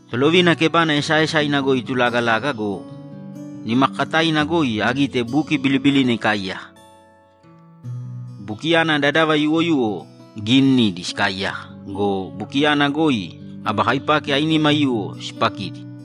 Tolovina kebana esaaesaina goi itulagalaga go, nimakakataina goi agite buki bilibilina ikaaiyaka. Bukiyana dadava yuwoyuwo giinidi sikaaiyaka go, bukiyana goi aba kaipaki ainima aiyuwo sipakidi.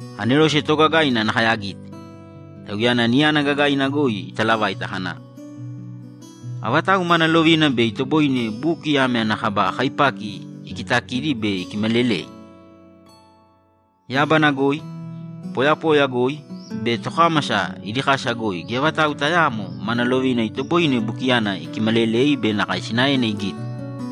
Anerose toogagaina nakae agite, tauyana niyana gagaina goi italavaita kana, ‘Avatau mana lovina bei itoboine buki ame ana kaba kaipaki ikitakidi be ikimalelei?’ Yábana goi, poyapoya goi be tokámasa idi kasa goi geya vatau tayaamo mana lovina itoboine bukiyana ikimalelei be nakae sinaena igite.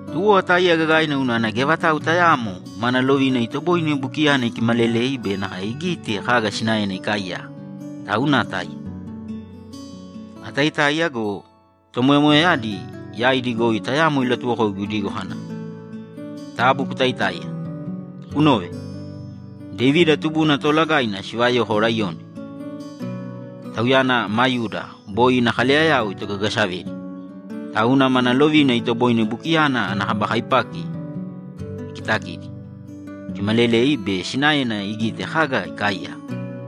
Tuwo atáiya gagaina unana geya vatau tayaamo mana lovina itoboine bukiyana ikimalelei be nakae igite kaga sinaena ikaaiyaka, tauna atáiya. Ataitáiya go, tomoyamoyayadi yaidi goi tayamo ilatuwokoigu idigo kana, ‘Taabu kutaitāiya. Kunōve! Devida tubuna Toolagaina sivayoko laiyoni. Tauyana ma Yuda boi ina kaleyayao itogagasavedi, tauna mana lovina itoboine bukiyana ana kaba kaipaki ikitakidi, ikimalelei bei sinaena igite kaga ikaaiyaka.’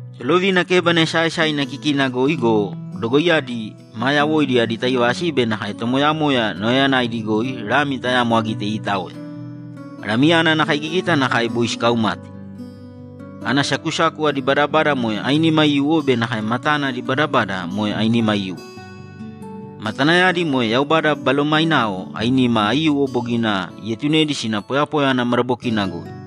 Tolovina kebana esaaesaina kikina goi go, dogoiyadi maa yawoidi adi taivasi be nakae tomoyamoya nauyayanaidi goi Lami tayamo agite iitaoya. Lamiyana ana kaigigita nakae boi sikaumate. Ana sakusaku adi badabada moe ainima aiyuwo be nakae matana adi badabada moe ainima aiyuwo. Matanayadi moe Yaubada Balomainao ainima aiyuwo bogina ietunedi sina poyapoya ana madabokina goi.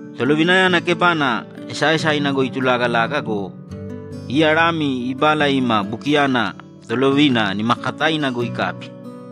Tolovinayana kebana esaaesaina goi itulagalaga go, iya Lami ibala ima bukiyana Tolovina nimakakataina goi ikabi.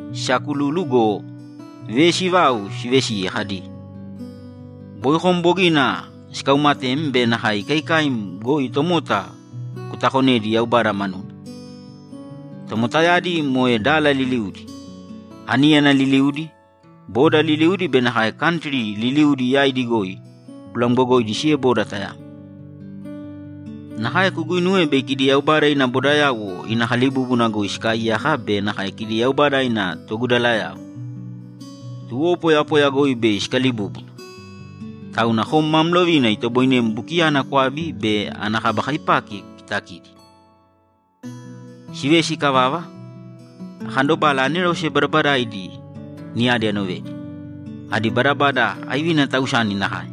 Sisaakululu go, vesi vau sivesiye kadi, ‘Boi kom bogina sikaumatem be nakae ikaikaim goi tomota kutakonedi Yaubada manuna. Tomotayadi moe dala liliudi, aníyana liliudi, boda liliudi be nakae kantri liliudi yaidi goi kulamgogoidi sieboda tayamo. Nakae kuguinuwe bei kidi Yaubada ina bodayauwo ina kalibúbuna goi sikaaiyaka be nakae kidi Yaubada ina togudalayao. Tuwo poyapoya goi bei sikalibúbuna. Tauna kom mam lovina itoboinem bukiyana kwabi be ana kaba kaipaki kukitakidi.’ Sivesi ikavava, akandobala anerose badabadaaidi niyadi anovedi. Adi badabada aivina tausani nakae;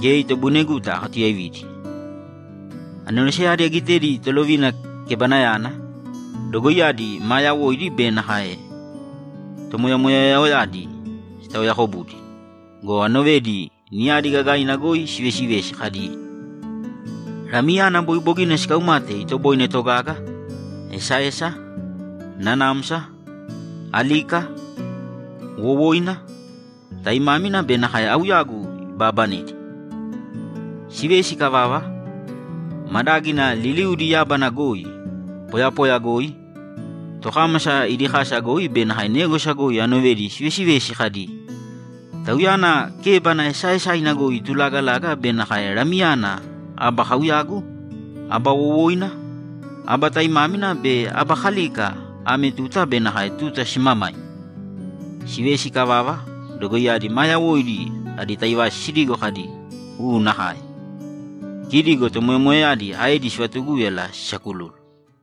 geya itoboineguta akatuyaividi. Aneroseyadi agitedi Tolovina kebanayana, dogoiyadi maa yawoidi be nakae tomoyamoyayadi sitaoyaakobudi go, anovedi, niyadi gagaina goi sivesivesi kadi, ‘Lamiyana boi bogina sikaumate itoboine togaga, esaesa, nanamsa, alika, wowoina, taimámina be nakae auyagu ibaabanedi!’ Sivesi ikavava, madágina liliudi yábana goi, poyapoya goi, tokámasa idi kasa goi be négwasa goi anovedi sivesivesi kadi, ‘Tauyana kébana esaaesaina goi itulagalaga be nakae Lamiyana aba kauyagu, aba wowoina, aba taimámina be aba kalika ame tuta be nakae tuta simamaima!’ Sivesi ikavava, dogoiyadi maa yawoidi adi taivasi sidigo kadi, ‘U nakae.’ Kidi go tomoyamoyayadi aedi sivatugúyala sisakululu.